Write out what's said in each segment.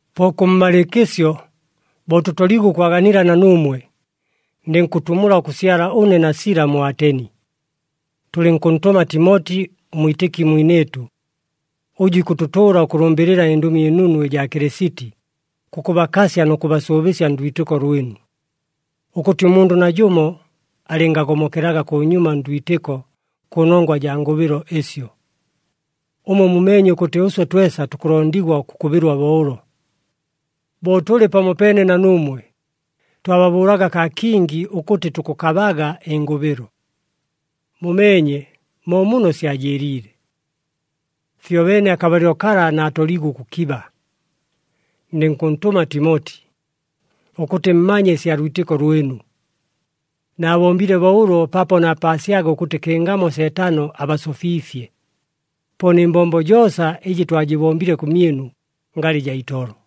Po kʉmmalɨɨkɨsyo, bo tʉtoliigwe ʉkwaganila na nuumwe, ndɨnkʉtumula ʉkʉsyala ʉne na Sila mu Ateni. Tʉlɨnkʉntʉma Timoti, ʉmwitɨki mwinɨɨtʉ, ʉjʉ ikʉtʉtʉʉla ʉkʉlʉmbɨlɨla ɨNdʉmi ɨNunu ɨjaa Kɨlɨsiti, kʉkʉbakasya nʉ kʉbasʉʉbɨsya ndwitɨko lwɨnu, ʉkʉtɨ ʉmundʉ najʉmo alɨngagomokelaga kʉnyuma ndwitɨko kʉnongwa jaa ngʉbɨlo ɨsyo. Ʉmwe mumeenye ʉkʉtɨ ʉswe twesa tukʉlondigwa ʉkʉkʉbɨlwa bo ʉlo. Bo tʉlɨ pamopeene na nuumwe, twababʉʉlaga kaa kingi ʉkʉtɨ tukʉkabaga ɨngʉbɨlo. Mumeenye, mo muno syajɨɨliile. Fyobeene akabalɨlo kala naatoliigwe ʉkʉkiba, ndɨnkʉntʉma Timoti, ʉkʉtɨ mmanye ɨsya lwitɨko lwɨnu. Naabombile bo ʉlo paapo naapaasyaga ʉkʉtɨ kɨngamo Seetano abasofiifye. Po nɨ mbombo joosa ɨjɨ twajɨbombile kʉmyɨnu ngalɨ jaa itolo.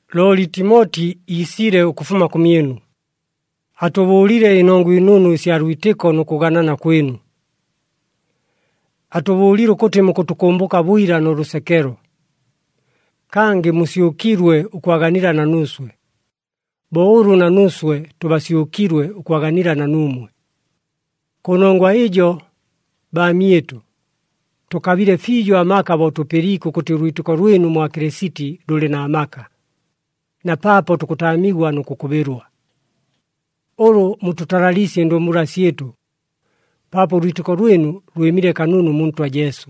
Looli Timoti iisile ʉkʉfuma kʉmyɨnu, atʉbʉʉlile ɨnongwa ɨnunu ɨsya lwitɨko nʉ kʉganana kwɨnu. Atʉbʉʉlile ʉkʉtɨ mukʉtʉkʉmbʉka bwila nʉ lʉsekelo, kangɨ musyʉkilwe ʉkwaganila na nuuswe, bo ʉlʉ na nuuswe tʉbasyʉkilwe ʉkwaganila na nuumwe. Kʉnongwa ɨjo, baamyɨtʉ, tʉkabile fiijo amaka bo tʉpɨliike ʉkʉtɨ ʉlwitɨko lwɨnu mwa Kɨlɨsiti lʉlɨ na maka, na paapo tukʉtaamigwa nʉ kʉkʉbɨlwa. Ʉlʉ mutʉtalaliisye ɨndumbula syɨtʉ, paapo ʉlwitɨko lwɨnu lwɨmile kanunu mu Ntwa Jesu.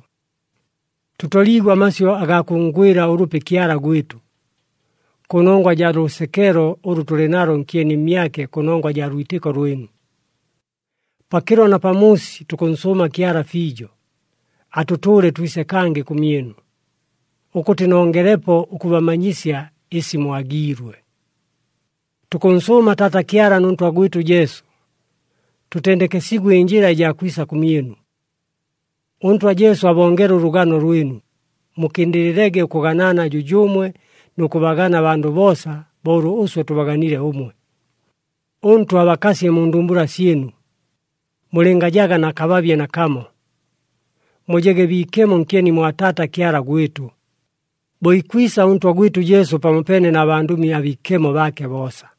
Tʉtoliigwe amasyʉ agaa kʉnngwɨla ʉlʉpi Kyala gwɨtʉ, kʉnongwa jaa lʉsekelo ʉlʉ tʉlɨ nalo nkyeni mmyake kʉnongwa jaa lwitɨko lwɨnu. Pakɨlo na pamuusi tukʉnsʉʉma Kyala fiijo, atʉtʉʉle twise kangɨ kʉmyɨnu, ʉkʉtɨ nongelepo ʉkʉbamanyisya ɨsi mwagiilwe. Tukʉnsʉʉma Taata Kyala nʉ Ntwa gwɨtʉ Jesu, tʉtendekesigwe ɨnjɨla ɨjaa kwisa kʉmyɨnu. ɄNtwa Jesu abongele ʉlʉgano lwɨnu, mukɨndɨlɨlege ʉkʉganana jʉjʉʉmwe nʉ kʉbagana abandʉ boosa, bo ʉlʉ ʉswe tʉbaganile ʉmwe. ɄNtwa abakasye mu ndumbula syɨnu, mulɨngajaga na kababye nakamo, mujege biikemo nkyeni mwa Taata Kyala gwɨtʉ, bo ikwisa ʉNtwa gwɨtʉ Jesu pamopeene na bandʉmi abiikemo baake boosa.